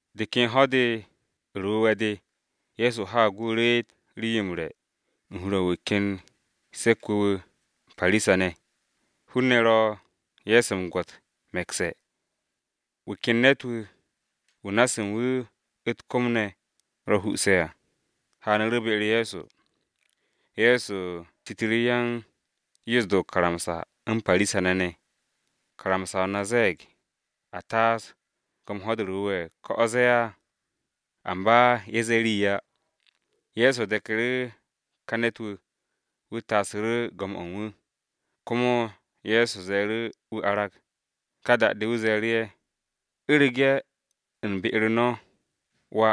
De ken Ho̱-de u̱r-Wu̱we̱ de, Ye̱so haag wu̱ reet rii-yo m-re̱ u̱n hur-o u̱n wu̱ ken caari-wu̱ wu̱ u̱n Parisa-ne̱, hun-ne̱ ro̱ Ye̱so m-gwo̱t me̱kse̱. Wu̱ ken ne̱t-wu̱, wu̱ na-se u̱n wu̱, u̱t-kom ne̱ ro huse̱ à, haanu̱ru̱ be-u̱r Ye̱so. Ye̱so citu̱ru̱ yan-Napse̱ o-karamsa u̱n Parisa-ne̱ ne̱, “¿Karamsa-o na ze̱e̱g a taas go̱m Ho̱-de u̱r-Wu̱we̱ ko̱ o̱ ze̱e̱ á?” Amba ye̱ ze̱e̱ rii á. Ye̱so deku̱ru̱ ka ne̱t-wu̱, wu̱ taasu̱ru̱ go̱m-o u̱n wu̱, komo Ye̱so ze̱e̱ru̱ wu̱ arag. Ka da-de wu̱ ze̱e̱ru̱ ye̱, “U̱rege̱ u̱n be-u̱r no̱, wà,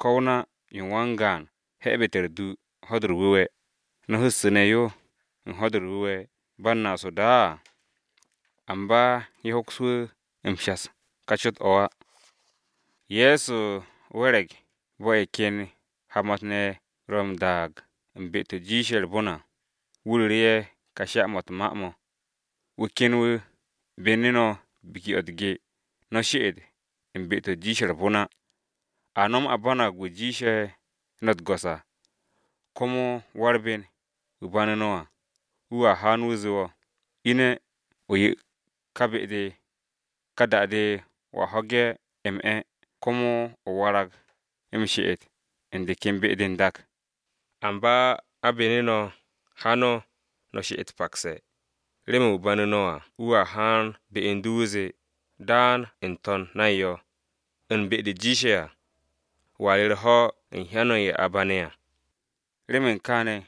ko̱ o-na yo u̱n wan-gaan he̱bu̱te̱ u̱r-dù Ho̱-de u̱r-Wu̱we̱, ¿no̱a hu̱ssu̱ne̱ yo u̱n Ho̱-de u̱r-Wu̱we̱ ba u̱n naas o-da á?” Amba ye̱ hoks wu̱ m-shas u̱n ka cot-o̱ á. Ye̱so we̱re̱g bo̱ ye̱ ken hamat-ne̱ ye̱ ro̱ m-daag u̱n be-to̱ jiishe̱ u̱r-bon à, wu̱ ru̱ru̱ ye̱ ka sha-mo̱ u̱t-ma mo̱: “Wu̱ ken wu̱ bene̱ no̱ gwo̱nge̱-o̱ u̱t-ge, no̱ she'et u̱n be-to̱ jiishe̱ u̱r-bon á. A nom a banag wu̱ jiishe̱ no̱ u̱t-go̱s à. Komo wa-u̱r-ben, wu̱ banu̱ no̱ à, wu̱a haan wu̱ zee wo̱, ‘Ine̱, o 'ye wu̱ ka ká be-de.’ Ka da-de wo̱a ho̱ge̱ m-'e̱ komo o warag m-she'et u̱n de ken be-de n-dak. Amba a bene̱ no̱, ha no̱, no̱ she'et pakse̱, remen wu̱ banu̱ no̱ à wu̱a haan be u̱n du wu̱ zee, ‘Daan n-to̱n nay yo, u̱n be-de jiishe̱ à.’ Wo̱a re̱ u̱r-ho̱ u̱n hyan-o̱ ye̱ a bane̱ à. Remen kaane̱,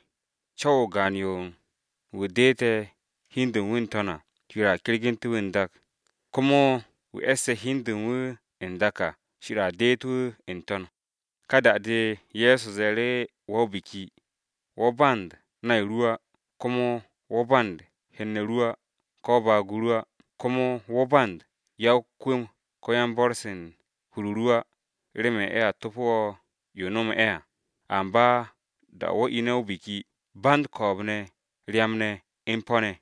co̱w-o o-gaan yo u̱n wu̱ deete̱ hi u̱n de u̱n wu̱ n-to̱n ne̱ à, Shir a kergu̱nte̱ wu̱ n-dak. Komo wu̱ e̱sse̱ hi u̱n de u̱n wu̱ n-dak à, Shir a deet wu̱ n-to̱n.” Ka da-de, Ye̱so ze̱e̱ru̱ wa-o-biki, “Wo̱ band nay ru á, komo wo̱ band hen-ne̱ ru á ko̱ baag-o ru á, komo wo̱ band ya-o-kwu̱m ko̱ yan-bo̱r-se u̱n hur-o ru á, remen ye̱a topo wo̱ yo o nome̱ ye̱ à. Amba da-o̱ wo̱ ine̱ o-biki, ban ko̱o̱b-ne̱, u̱n ryam-ne̱ ne̱ u̱n po̱-ne̱ ne̱.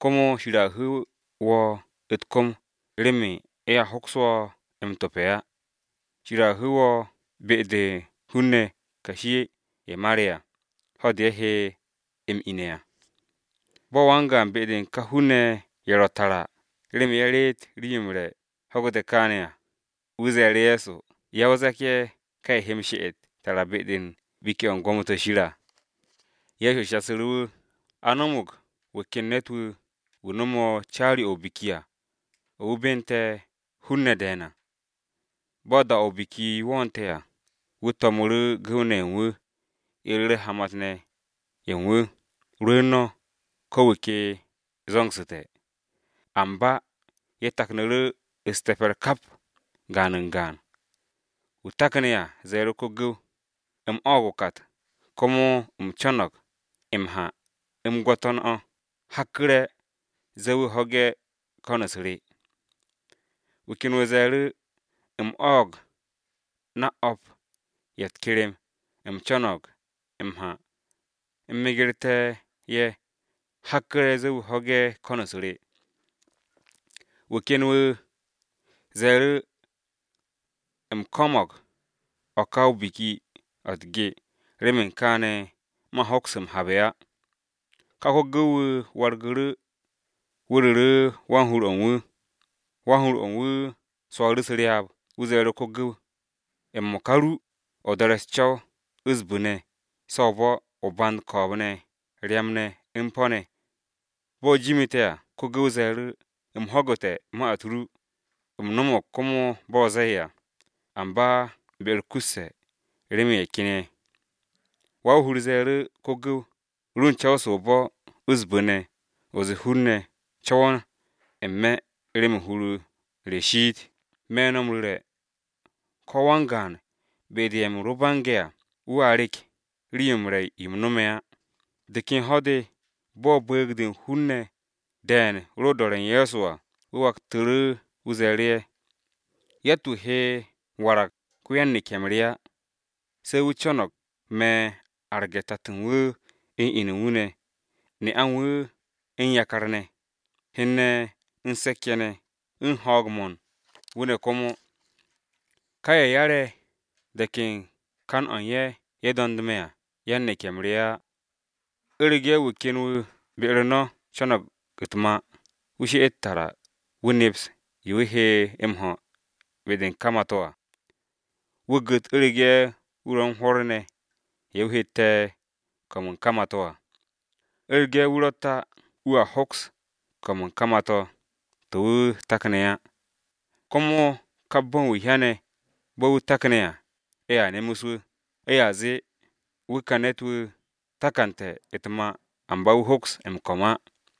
Komo Shir a hu̱u̱ wo̱ u̱t-kom, remen ye̱a hoks wo̱ m-tope̱ á. Shir a hu̱u̱ wo̱ be-de u̱n hun-ne̱ kashi-ye̱ mare̱ à, ho̱-de ye̱ he m-ine̱ à.” Bo̱ wan-gaan be-de u̱n ka hun-ne̱ ye̱ ro̱ tara, remen ye̱ reet rii-yo m-re̱ ho̱gu̱te̱ kaane̱ à, wu̱ ze̱e̱ru̱ Ye̱so, “Ya-o-zak-ye̱ ka ye̱ he m-she'et tara be-de u̱n biki-o̱ u̱n gwo̱mo-to̱ Shir à!” Ye̱so ze̱e̱ru̱ wu̱, “A no̱mo̱g wu̱ ken ne̱t-wu̱, wu̱ no̱me̱ caari-o̱ o-biki à, o̱ wu̱ bente̱ hun-ne̱ de̱e̱n à. Bo̱ da-o̱ o-biki wo̱o̱nte̱ à, wu̱ to̱mu̱ru̱ gu̱w-ne̱ ye̱ u̱n wu̱, ye̱ ru̱re̱ hamat-ne̱ ye̱ u̱n wu̱, ‘Rwu̱u̱n no̱, ko̱ wu̱ ke zo̱ngsu̱te̱!’ Amba ye̱ taknu̱ru̱ hoob-o u̱s-cow kap, gaan u̱n gaan. Wu̱ takne̱ à ze̱e̱ru̱ ko-gu̱w, ‘U̱m o̱o̱g o-kat, komo u̱m co̱no̱g m-ha u̱m gwo̱to̱n o̱, hakku̱re̱ ze̱e̱ wu̱ ho̱ge̱ ko̱n-u̱s re!’ Wu̱ ken wu̱ ze̱e̱ru̱, ‘U̱m o̱o̱g na o̱p ye̱ u̱t-kerem, u̱m co̱no̱g m-ha u̱m megerte̱ ye̱, hakku̱re̱ ze̱e̱ wu̱ ho̱ge̱ ko̱n-u̱s re.’ Wu̱ ken wu̱ ze̱e̱ru̱, ‘U̱m ko̱mo̱g o̱ ka biki-o̱ u̱t-ge, remen kaane̱ man hoks m-habe̱ á.’ “Ka ko-gu̱w-wu̱ wargu̱ru̱ wu̱ ru̱ru̱ wan-hur-o̱ u̱n wu̱. Wan-hur-o̱ u̱n wu̱ swo̱o̱ru̱ u̱s-ryaab. Wu̱ ze̱e̱ru̱ ko-gu̱w, ‘M-mo̱ka ru, o do̱re̱ u̱s-co̱w u̱s-bu̱ ne̱ se o-bo̱, o band ko̱o̱b-ne̱, ryam-ne̱, u̱n po̱-ne̱ ne̱.’ Bo̱ jimu̱te̱ à, ko-gu̱w ze̱e̱ru̱, ‘Go̱s-wu̱, u̱m ho̱gu̱te̱ ma-u̱t ru, u̱m no̱mo̱g komo bo̱ o zee à, amba be-u̱r kusse̱ remen ye̱ ken ye̱.’ Wa-o-hur ze̱e̱ru̱ ko-gu̱w, ‘Ru u̱n co̱w-se o-bo̱, u̱s-bu̱ ne̱, o ze̱e̱ hun-ne̱ co̱wo̱n n-me̱ remen hur-o re shiit.’ Me̱ no̱ m-ru̱re̱ ko-wan-gaan be-de u̱n ye̱ u̱m ro bange̱ à, wu̱a rek rii-yo m-re̱ yo m-no̱me̱ á.” De ken ho̱-de bo̱ bu̱u̱g-de u̱n hun-ne̱ de̱e̱n ro u̱n do̱re̱ u̱n Ye̱so à, wu̱ waktu̱ru̱ wu̱ ze̱e̱ru̱ ye̱, “Yatt-wu̱ he warag wan-neke̱-m re ye̱ á, se wu̱ co̱no̱g me̱ arge̱ tato u̱n wu̱, u̱n inu u̱n wu̱ ne̱, ne'a u̱n wu̱, u̱n yakar ne̱, hen-ne̱ u̱n se̱k-ye̱ ne̱, u̱n ho̱o̱g-mo̱ u̱n wu̱ ne̱ komo. Ka ye̱ 'yare̱ de̱k u̱n kan-o̱ u̱n ye̱, ye̱ do̱nd me̱ á, yan-neke̱-m re ye̱ á. “U̱rege̱ wu̱ ken wu̱ be-u̱r no̱ co̱no̱g u̱t-mà, wu̱ she'et tara wu̱ neps yo wu̱ he m-ho̱ be-de u̱n ka mà-to̱ à, wu̱ gu̱t u̱rege̱ wu̱ ro̱ u̱n hwo̱r ne̱ ye̱ wu̱ hette̱ kom u̱n ka mà-to̱ à. U̱rege̱ wu̱ ro̱tt á, wu̱a hoks ko̱m u̱n ka mà-to̱, to̱ wu̱ takne̱ á, komo kap bo̱n ye̱ hyane̱ bo̱ wu̱ takne̱ à ye̱a nemes wu̱. Ye̱a zee, ‘Wu̱ ka ne̱t-wu̱ takante̱ u̱t-mà amba wu̱ hoks m-ko̱m á!’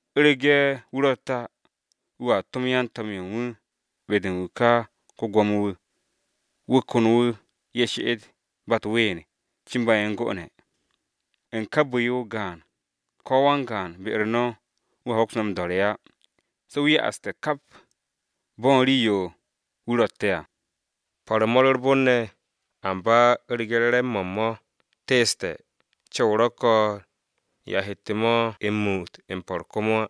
U̱rege̱ wu̱ ro̱tt á, wu̱a tom yan-to̱m-ye̱ u̱n wu̱ be-de u̱n wu̱ ka ko-gwo̱mo-wu̱, wu̱ ko̱n wu̱ ye̱ she'et ba u̱t-ween cin ba ye̱ u̱n 'gone̱. U̱n ka bu̱-yo o-gaan, ko̱ wan-gaan be-u̱r no̱ wu̱a hoks me̱ m-do̱re̱ á, se̱ wu̱ ya'aste̱ kap bo̱ u̱n rii-yo wu̱ ro̱tte̱ à.” “Po̱r-mo̱ u̱r-bon ne̱, amba u̱rege̱ re̱re̱m-mo̱ u̱n mo̱ teeste̱, co̱w ro̱ ko̱n, yo a hette̱ mo̱ m-muut m-po̱r komo á.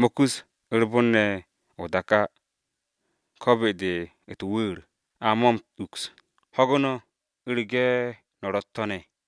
Mo̱ kus u̱r-bon ne̱ o-dak á, ko̱ be-de u̱t-wu̱u̱r, a mo̱ m-uks. Ho̱gu̱ no̱, u̱rege̱ no̱ ro̱ u̱t-to̱ ne̱.”